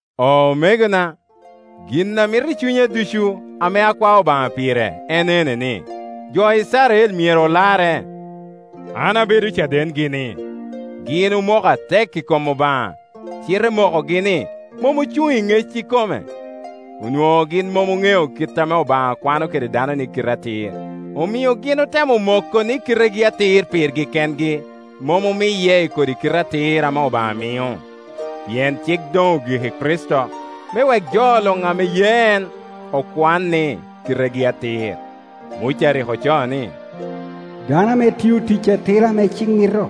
Omegona, gin ame amito i cunya ducu, ame akwao Obaŋa pire, en ene ni, jo Icrael myero olarre. An abedo cadengi ni, gin omoko atek i kom Obaŋa, cite mokogi-ni mom ocuŋ i ŋec ikome. Onwoŋo gin mom oŋeo kit ame Obaŋa kwano kede dano ni kite atir, omio gin otemo moko ni kitegi atir pirgi kengi, mom omiye i kodi kite atir ame Obaŋa mio. Pien cik doŋ ogik i Kricito, me wek jo luŋ ame ye en okwan ni kitegi atir. Muca rik ocoo ni, dano ame tio tic atira ame cik mito,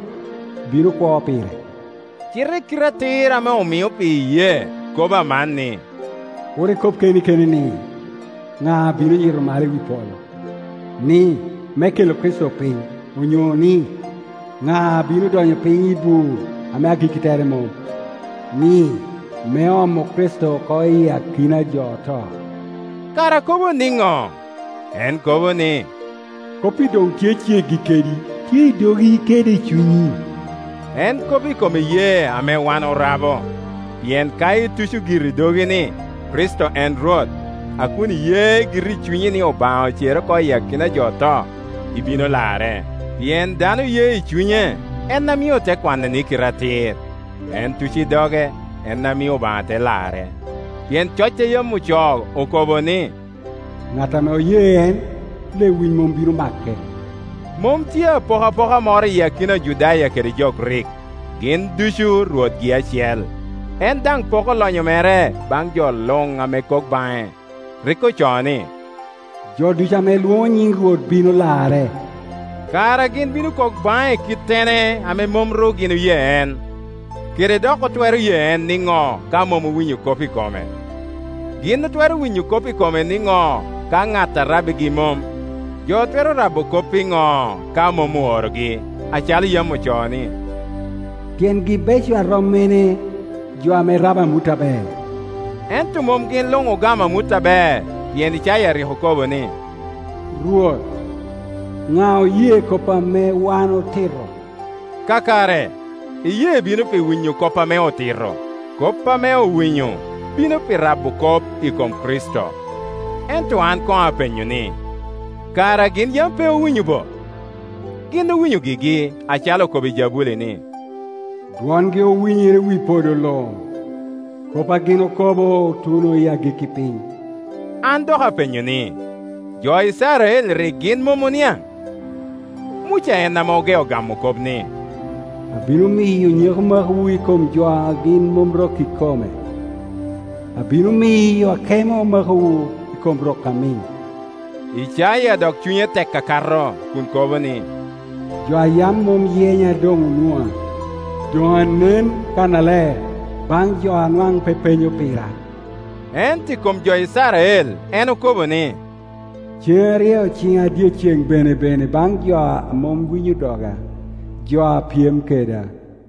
bino kwo pire. Cite kite atir ame omio pi iyee kobo aman, ni, “Kur ikob keni keni ni, ‘Ŋaa bino yito malo i polo?’ (ni, me kela Kricito piny), onyo ni, ‘Ŋa bino donyo piny i bur ame agikki tere mom?’” (ni, me omo Kricito oko iyi akina a jo oto). Kara kobo niŋo? En kobo ni, “Kop-pi doŋ tye ceggi kedi, tye i dogi kede i cunyi,” en kop i kom iyee ame wan orabo. Pien ka ituco giri i dogi ni, “Kricito en Rwot”, a kun iye giri i cunyi ni Obaŋa ocere oko iyi akina a jo oto, ibino larre. Pien dano ye i cunye, en a mio ote kwane ni kite atir; en tuco i doge, en a mio Obaŋa te lare. Pien coc a yam ocoo okobo ni, “Ŋat ame oye en, lewic mom bino make.” Mom tye apokapoka moro i akina Ojudaya kede jo Grik; gin ducu Rwotgi acel, en daŋ poko lonyo mere baŋ jo luŋ ame kok baŋe. Rik ocoo ni, “Jo ducu ame lwoŋo nyin Rwot bino larre.” Kara gin bino kok baŋe i kittene, ame mom ru gin oye en? Kede dok otwero ye en nino, ka mom owinyo kop i kome? Gin otwero winyo kop i kome niŋo ka ŋat a rabbigi mom? Jo twero rabo kop iŋo ka mom oorogi? Acalo yam ocoo ni, “Tyengi beco a rom mene, jo ame rabo amut aber!” Ento mom gin luŋ ogamo amut aber; pien Icaya rik okobo ni, “Rwot, ŋa oye kop ame wan otito?” Kakare, iyee bino pi winyo kop ame otito, kop ame owinyo bino pi rabo kop i kom Kricito. Ento an koŋ apenyo ni, “Kara gin yam pe owinyo bo?” Gin owinyo gigi, acalo okobo i jabuli ni, “Dwongi owinyere i wi podo luŋ; kop a gin okobo otuno i agikki piny.” An dok apenyo ni, “Jo Icrael rik gin mom oniaŋ?” Muca en ame ogeo gamo kop, ni, “Abino miyo nyeko makowu i kom jo a gin mom rok ikome, abino miyo akemo makowu i kom rok amiŋ.” Icaya dok cunye tek akato kun kobo ni, “Jo a yam mom yenya doŋ onwoŋa, doŋ anen kannaler baŋ jo a nwaŋ pe penyo pira.” Ento i kom jo Icrael en okobo ni, “Ceŋ aryeo ciŋa dyeceŋ benebene baŋ jo a mom winyo doga, jo a pyem keda.”